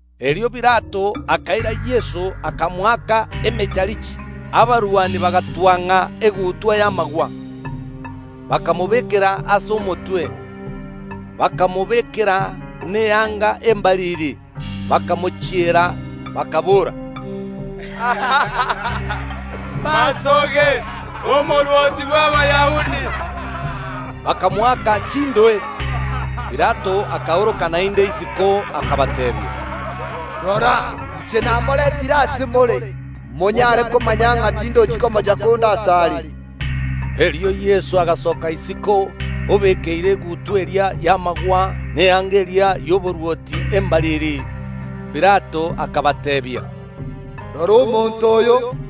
Erio Pilato akaira Yeso, akamoaka emecharichi. Abarwani bagatwang’a egutwa y’amagwa, bakamobekera ase omotwe, bakamobekera na eanga embariri, bakamochiera, bakaboora, “Masoge, Omorwoti bw’Abayahudi!” Bakamoaka chindoe. Pilato akaoroka naende isiko, akabateebia, “Rora, inche namorentire ase more, monyare komanya ng’a tindochi komocha konde asare.” Erio Yeso agasoka isiko, obekeire egutwa eria y’amagwa na eanga eria y’oborwoti embariri. Pilato akabateebia, “Rora omonto oyo!”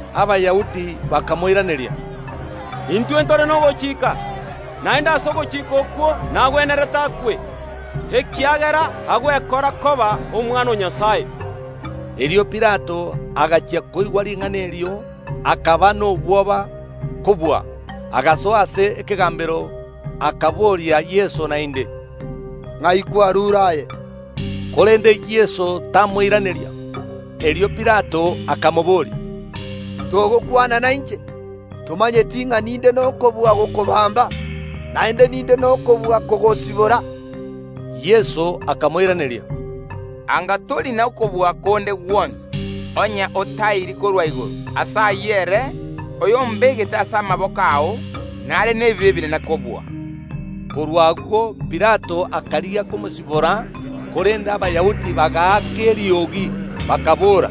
Abayahudi bakamoiraneria, “Intwe ntore nogochika, naende ase ogochika okwo nagwenerete akwe, ekiagera agwekora koba Omwana o Nyasae.” Erio Pilato agachia koigwa ring’ana erio, akaba nobwoba kobua. Agasoa ase ekegambero, akaboria Yeso naende, “Ing’ai kwarure aye?” Korende Yeso tamoiraneria. Erio Pilato akamobooria, “Togokwana nainche? Tomanyeti ng’a ninde nokobua gokobamba, naende ninde nokobua kogosibora?” Yeso akamoiraneria, “Anga tori nokobua konde gwonsi, onye otaeiri korwa igoro; ase ayio ere oyombegete ase amaboko ao nare nebibe ebinene kobua.” Korwa agwo Pilato akarigia komosibora, korende Abayahudi bagaaka eriogi, bakaboora,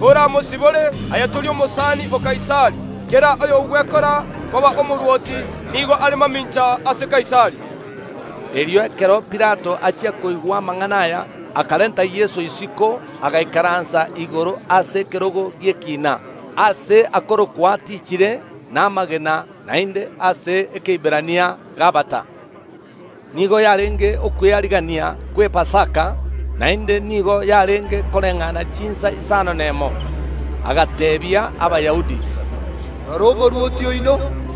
“Koramosibore, aye tori omosani o Kaisari; kera oyogwekora koba omorwoti nigo are mamincha ase Kaisari.” Erio ekero Pilato achia koigwa amang’ana aya, akarenta Yeso isiko, agaikaransa igoro ase ekerogo gi’ekina, aase akorokwa Atichire n’Amagena, naende ase Ekeiberania, Gabata. Nigo yarenge Okwearigania gw’Epasaka; naende nigo yarenge koreng’ana chinsa isano nemo. Agateebia Abayahudi, “Rora omorwoti oino!”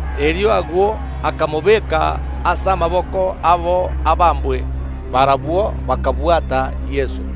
Erio agwo akamobeka ase amaboko abo abambwe. Barabwo bakabwata Yeso.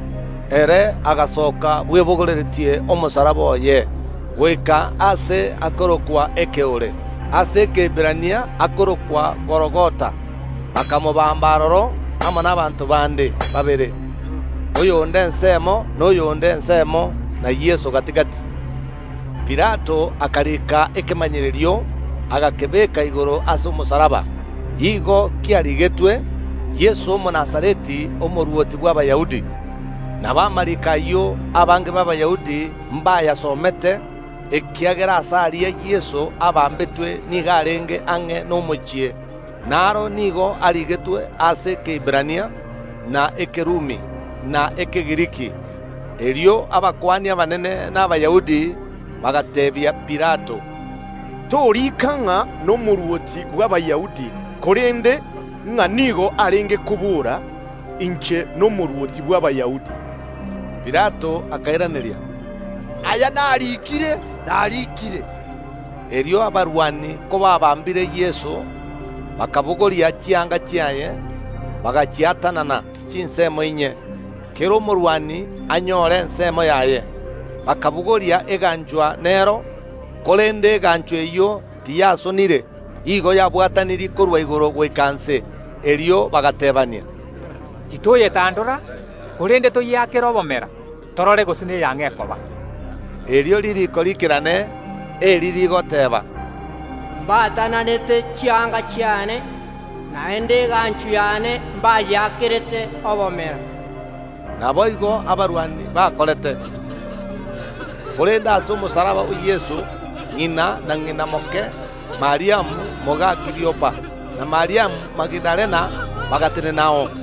Ere agasoka bwebogoreretie omosalaba oye, goika aase akorokwa Ekeore; ase Ekeiberania akorokwa Gologotha. Bakamobamba aroro amo nabaanto bande babere, oyonde ensemo, na oyonde ensemo, na Yeso gati‐gati. Pilato akarika ekemanyererio, agakebeka igoro ase omosalaba. Igo kiarigetwe, “YESO OMONAZARETI, OMORWOTI BW’ABAYAHUDI.” Nabo amariiko ayio abange b’Abayahudi mbayasomete, ekiagera aase aria Yeso abamberetwe nigo arenge ang’e nomochie; naro nigo arigetwe ase Ekeiberania, na Ekerumi, na Ekegiriki. Erio abakuani abanene na Abayahudi bagateebia Pilato, “Torika ng’a, n’Omorwoti bw’Abayahudi, korende ng’a nigo arenge kobora: Inche nomorwoti bw’Abayahudi.” Pilato akairaneria, “Aya nariikire, nariikire.” Erio abarwani kobaabambire Yeso, bakabogoria chianga chiaye, bagachiatanana chinsemo inye, kera omorwani anyore ensemo yaye. Bakabogoria eganchwa nero. Korende eganchwa eyio tiyasonire; igo yabwatanirie korwa igoro goika inse. Erio bagateebania, “Titoyetandora, korende toyeakere obomera, torore gose neya ng’o ekoba.” Erio ririiko riikerane, eri rigoteeba, “Mbaatananete chianga chiane, naende eganchwa yane mbayekorerete obomera.” Naboigo abarwani bakorete. Korende ase omosalaba o Yeso ng’ina, na ng’ina moke, Mariamu moga Kiliopa, na Mariamu Magidalena bagatenenao.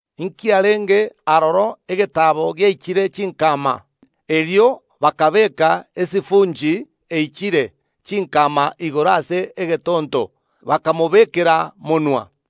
Nkiarenge aroro egetaabo giaichire chinkama, erio bakabeeka esifunchi eichire chinkama igoro ase egetonto, bakamobekera monwa.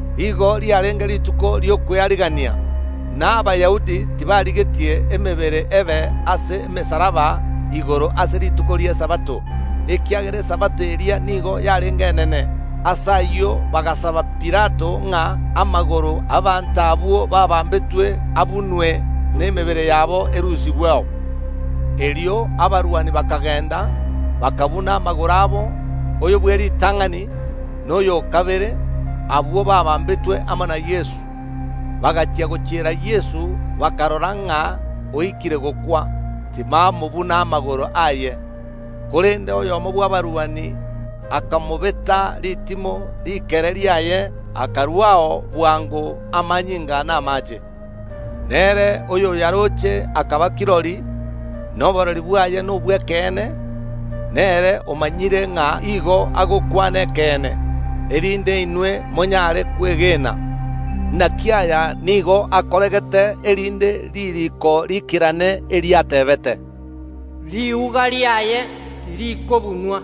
Igo riarenge rituko ri’Okwearigania, na Abayahudi tibarigetie emebere ebe ase emesalaba igoro ase rituko ri’Esabato, ekiagera Esabato eria nigo yarenge enene. Ase ayio bagasaba Pilato ng’a amagoro y’abaanto abwo baabambetwe abunwe, na emebere yabo erusigweo. Erio abarwani bakagenda, bakabuna amagoro abo, oyo bw’eritang’ani, na oyo o kabere, abwo baabambetwe amo na Yeso. Bagachia gochiera Yeso, bakarora ng’a oikire gokwa, tibamobuna amagoro aye. Korende oyomo bw’abarwani akamobeta ritimo rikere riaye, akaruao bwango amanyinga na amaache. Nere oyoyaroche akaba kirori, na oborori bwaye nobw’ekeene, nere omanyire ng’a igo agokwana ekeene, erinde inwe monyare kwegena. Naki aya nigo akoregete erinde ririiko riikerane, eriateebete, “Riuga riaye tirikobunwa.”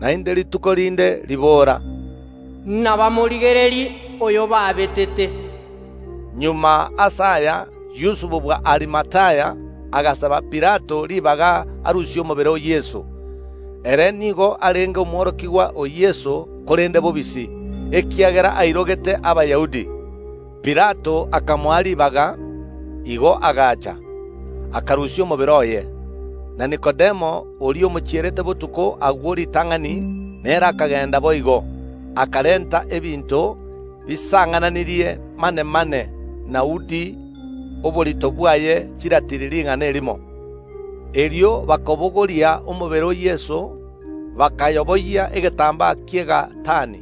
Naende rituko rinde ribora, “Nabamorigererie oyobabetete.” Magega ase aya Yusufu bw’Arimathaya agasaba Pilato ribaga arusie omobere o Yeso. Ere nigo arenge omworokigwa o Yeso, korende bobisi, ekiagera airogete Abayahudi. Pilato akamoa ribaga. Igo agacha, akarusia omobere oye. Na Nikodemo oria omochierete botuko agwo ritang’ani, nere akagenda boigo, akarenta ebinto bisang’ananirie manemane na uudi, oborito bwaye chiratili rigana erimo. Erio bakabogoria omobere o Yeso, bakayoboyia egetambaa ki’egatani,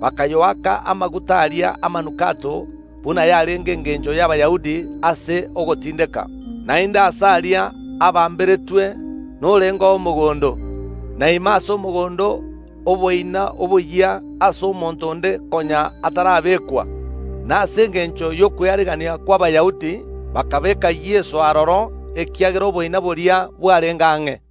bakayoaka amaguta aria amanukato, buna yarenge engencho y’Abayahudi ase ogotindeka. Naende aase aria abamberetwe norengeo omogondo, na ime ase omogondo oboina oboyia, aase monto onde konya atarabekwa. Na ase engencho y’Okwearigania kw’Abayahudi bakabeeka Yeso aroro, ekiagera oboina boria bwarenge ang’e.